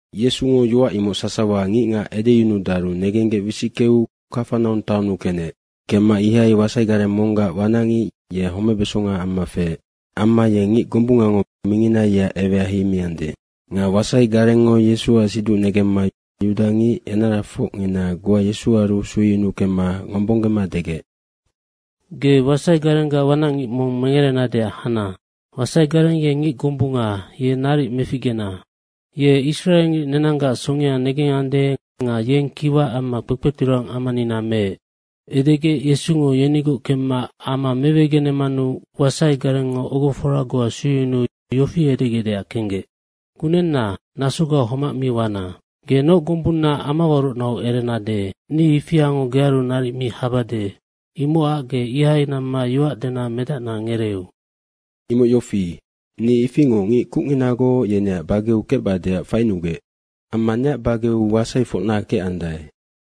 Yesungo yoac imoc sasawa ngicngac edeyunudaru negenggec wisickeu Kafanaung taonnu kenec. Kemma ihai wasai gareng monggac wanacngic ye homebesonga amma feec. Amma ye ngic gombungango mingina yeac ewea heimiande. Nga wasai garengngo Yesuac siduc negemma yudangic enarafocngina goa Yesuaru sueyunuu kemma ngombonggema degec, “Ge wasai garenggac wanacngic mong mengerenadeac hana. Wasai gareng ye ngic gombunga, ye naric meficgena. Ye israengic nenanggac songea negengande nga yeng kiwa amma kpekpeturang amanina meec.” Edegec Yesungo yenigoc kemma ama mewegenemanu wasai garengngo ogofora goa sueyunuu yofi edegecdeac kenggec, “Kunenna, nasoga homac mi wana. Ge noc gombunnaac amawarocnau erenade, ni ifiango gearu naric mi habade, imocac ge ihai namma yoac dena medacna ngereeu. Imoc yofi, ni ifingoc ngic kucnginagoc yeneac bageu kecbadeac fainugec. Amma neac bageu wasaifocna kecandae.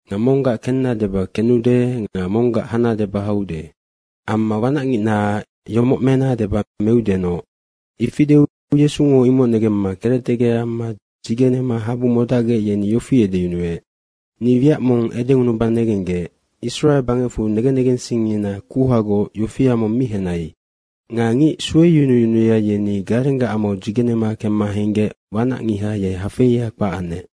Nga monggac kenna deba kenude nga monggac hana deba haude. Amma wanacngicnaac yomoc mena deba meudenoc.” Ifi deu Yesungo imoc negemma kerectegec amma dzigenema habu modacgec, yeni yofi edeyunuec, “Ni wiac mong edengunuba negenggec, Israe bangecfu negen negensingngina kuhagoc yofia mong mi henai.” Nga ngic sueyunuyunuya, yeni garenggac amau dzigenema kemma henggec wanacngiha ye hafeia kpac anec.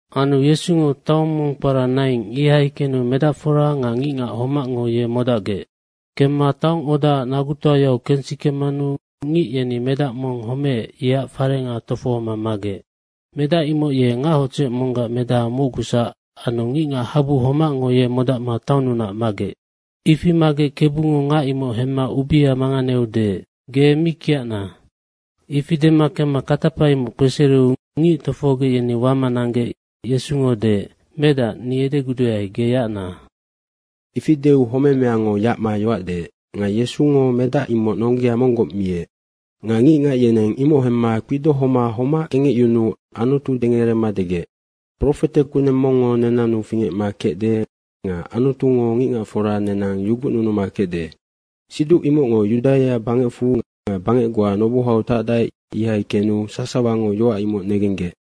Anu Yesungo taong mong kpara Naing, ihai kenu medacfora nga ngicngac homacngo ye modacgec. Kemma taongodaac nagutoayau kensikemanu ngic yeni medac mong homeec, yeac farenga tofohoma magec. Medac imoc ye ngac hodzec monggac medaha mocgusac anu ngicngac habu homacngo ye modacma taonnunac magec. Ifi magec Kebungo ngac imoc hemma ubea manganeu deec, “Ge mi kiacna.” Ifi dema kemma katapa imoc kpesereu ngic tofohogec, yeni wama nanggec Yesungo deec, “Medac, ni edeguduae, ge yacna.” Ifi deu homemeango yacma yoac deec. Nga Yesungo medac imoc nonggea monggoc miec. Nga ngicngac yeneng imoc hemma kpidohoma homac kengecyunuu Anutu dengerema degec, “Profete kuneng mongngo nenannu fingecma kecde nga Anutungo ngicngacfora nenang yugucnunuma kecde.” Siduc imocngo Yudaia bangecfu nga bangec goa nobohau tacdae, ihai kenu sasawango yoac imoc negenggec.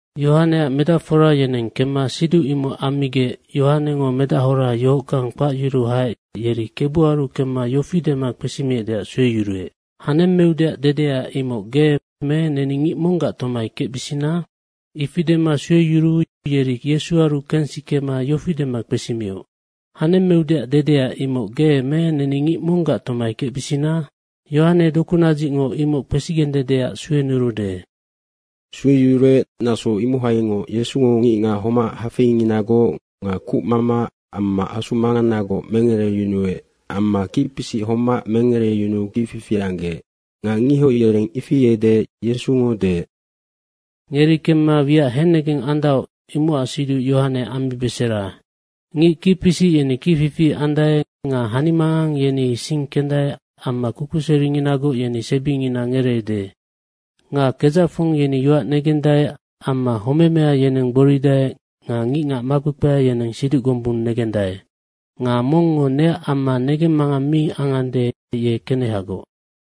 Yohaneac medacfora yeneng kemma siduc imoc ammigec Yohanengo medahora yohockang kpacyuruu haec yeri Kebuaru kemma yofi dema kpesimiecdeac sueyuruec, “Hanemmeudeac dedea, imoc ge me neni ngic monggac tomai kecbisina?” Ifi dema sueyuruu yeri Yesuaru kensikema yofi dema kpesimioc, “Hanemmeudeac dedea, imoc ge me neni ngic monggac tomai kecbisina? Yohane dokunadzicngo imoc kpesigendedeac suenurude.” Sueyuruec, naso imohaingoc Yesungo ngicngac homac hafeinginagoc nga kucmama amma asu manganagoc mengereyunuec amma kicpisic homac mengereyunuu kicfifi anggec. Nga ngihoc yereng ifi edeec Yesungo deec, “Ngeri kemma wiac hennegeng andaoc, imocac siduc Yohane ammibesera. Ngic kicpisic yeni kicfifi andae nga hanimangang yeni sing kendae amma kukuseringinagoc yeni sebingina ngereede. Nga kedzacfong yeni yoac negendae amma homemea, yeneng gboridae nga ngicngac makpekpea yeneng siduc gombung negendae. Nga mongngo neac amma negemmangang mi angande, ye kenehagoc.”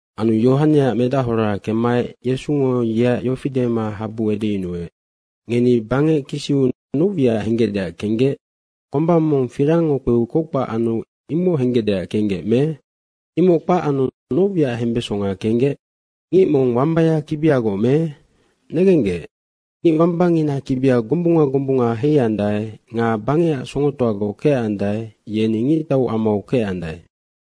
Anu Yohaneac medahora kemmaec Yesungo yeac yofi dema habu edeyunuec, “Ngeni bangec kisiu noc wiac henggecdeac kenggec? Komba mong firangngo kpeu kockpac anu, imoc henggecdeac kenggec me? Imoc kpac anu noc wiac hembesonga kenggec? Ngic mong wambaya kibiagoc me? Negenggec, ngic wambangina kibia gombunga gombunga heiandae nga bangecac songotoagoc kecandae, yeni ngictau amau kecandae.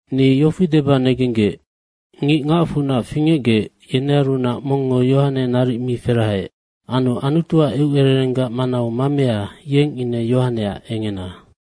Ni yofi deba negenggec, ngic ngacfunac fingecgec, yenearunac mongngo Yohane naric mi ferahaec. Anu Anutuac eucererenggac manau mamea, yeng ine Yohaneac engena.”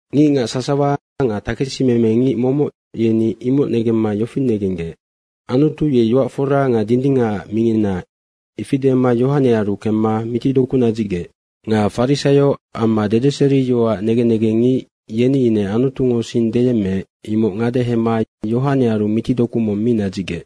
Ngicngac sasawa nga takesimemengic momoc, yeni imoc negemma yofi negenggec, Anutu ye yoac fora nga dindingacac mingina, ifi dema Yohanearu kemma mitidoku nadzicgec. Nga Farisaio amma dedeseriyoacac negen negengngic yeni ine Anutungo sing deyemmeec, imoc ngadehema Yohanearu mitidoku mong mi nadzicgec.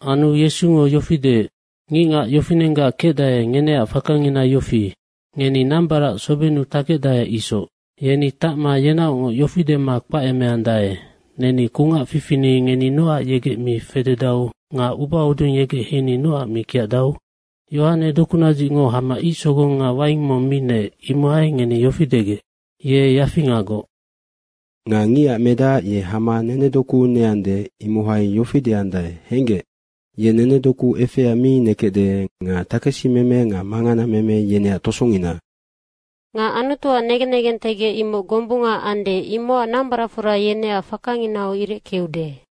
Anu Yesungo yofi deec, “Ngicngac yofinenggac kecdae, ngeneac fakangina yofi. Ngeni nambarac sobenu takecdae isoc. Yeni tacma yenaocngoc yofi dema kpacemeandae, ‘Neni kungac fifini ngeni nocac yegec mi fededau nga ubahodung yegec heini nocac mi kiacdau?’ Yohane dokunadzicngo hama ic sogong nga waing mong mi neec, imohai ngeni yofi degec, ‘Ye yafingagoc.’ Nga Ngicac Medac ye hama nenedoku neande, imohai yofi deandae, ‘Henggec, ye nenedoku efea mi nekecde nga takesimeme nga manganameme yeneac tosongina.’ Nga Anutuac negen negentegec imoc gombunga ande imocac nambaracfora yeneac fakanginau ireckeude.”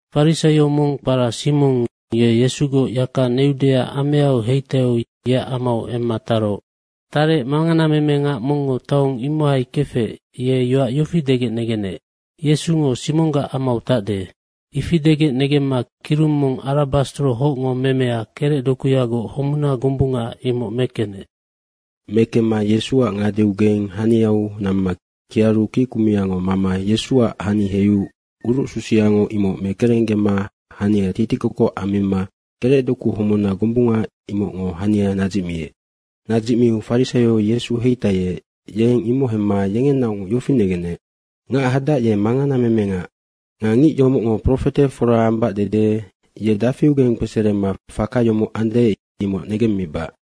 Farisaio mong kpara Simong ye Yesugoc yaka neudeac ameau heitaiu yeac amau emma taroc. Tarec manganamemengac mongngo taong imohai kefec, ye yoac yofi degec negenec, “Yesungo Simonggac amau tacde.” ifi degec negemma kirung mong arabastro hocngo memea kerecdokuyagoc homuna gombunga, imoc mekenec. Mekemma Yesuac ngadeaugeng haniau namma kiaru kickumiango mama Yesuac hani heiu urucsusiango imoc mekerenggema hania titikokoc ammima kerecdoku homuna gombunga imocngo hania nadzicmiec. Nadzicmiu farisaio Yesu heitaiec, yeng imoc hemma yengenaocngoc yofi negenec, “Ngac hadac ye manganamemengac. Nga ngic yomocngo profete fora ambac dede ye dafiugeng kpeserema faka yomoc ande, imoc negemmibac.”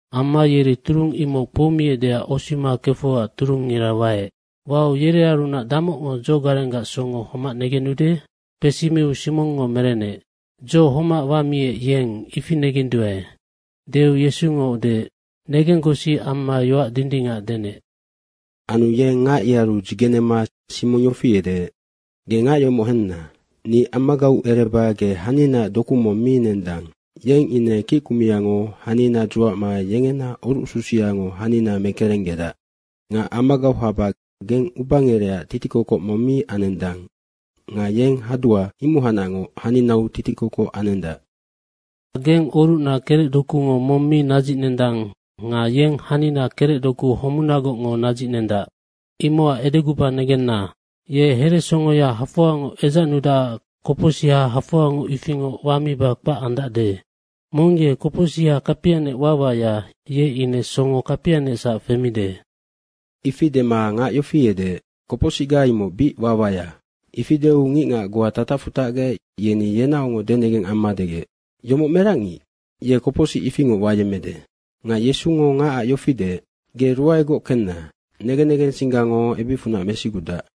Amma yeri turung imoc kpoumiecdeac osima kefecac turungngira waec. Wau yerearunac damocngo dzogarenggac songo homac negenude?” Kpesimiu Simongngo merenec, “Dzo homac wamiec yeng, ifi negenduae.” deu Yesungo deec, “Negenggosi amma yoac dindingac denec.” Anu yeng ngac yearu dzigenema Simong yofi edeec, “Ge ngac yomoc henna. Ni amagau ereba ge haninaac doku mong mi nendang, yeng ine kickumiango hanina dzuacma yengena orucsusiango hanina mekerenggedac. Nga amagau haba geng ubangerecac titikokoc mong mi anendang nga yeng hadua, imohacnacngoc haninau titikokoc anendac. Nga geng orucna kerecdokungo mong mi nadzicnendang nga yeng hanina kerecdoku homunagocngo nadzicnendac. Imocac edeguba negenna, ye heresongoya hafoangoc edzacnudacac kopocsiha hafoangoc ifingoc wamiba kpac andacde. Mong ye kopocsiha kapianec wawaya, ye ine songo kapianecsac femide.” Ifi dema ngac yofi edeec, “Kopocsicga imoc bic wawaya.” Ifi deu ngicngac goa tatacfu tacgec, yeni yenaocngoc denegeng amma degec, “Yomoc merac ngic? Ye kopocsic ifingoc wayemmede.” Nga Yesungo ngacac yofi deec, “Ge ruaegoc kenna. Negen negensinggango ebicfunac mesigudac.”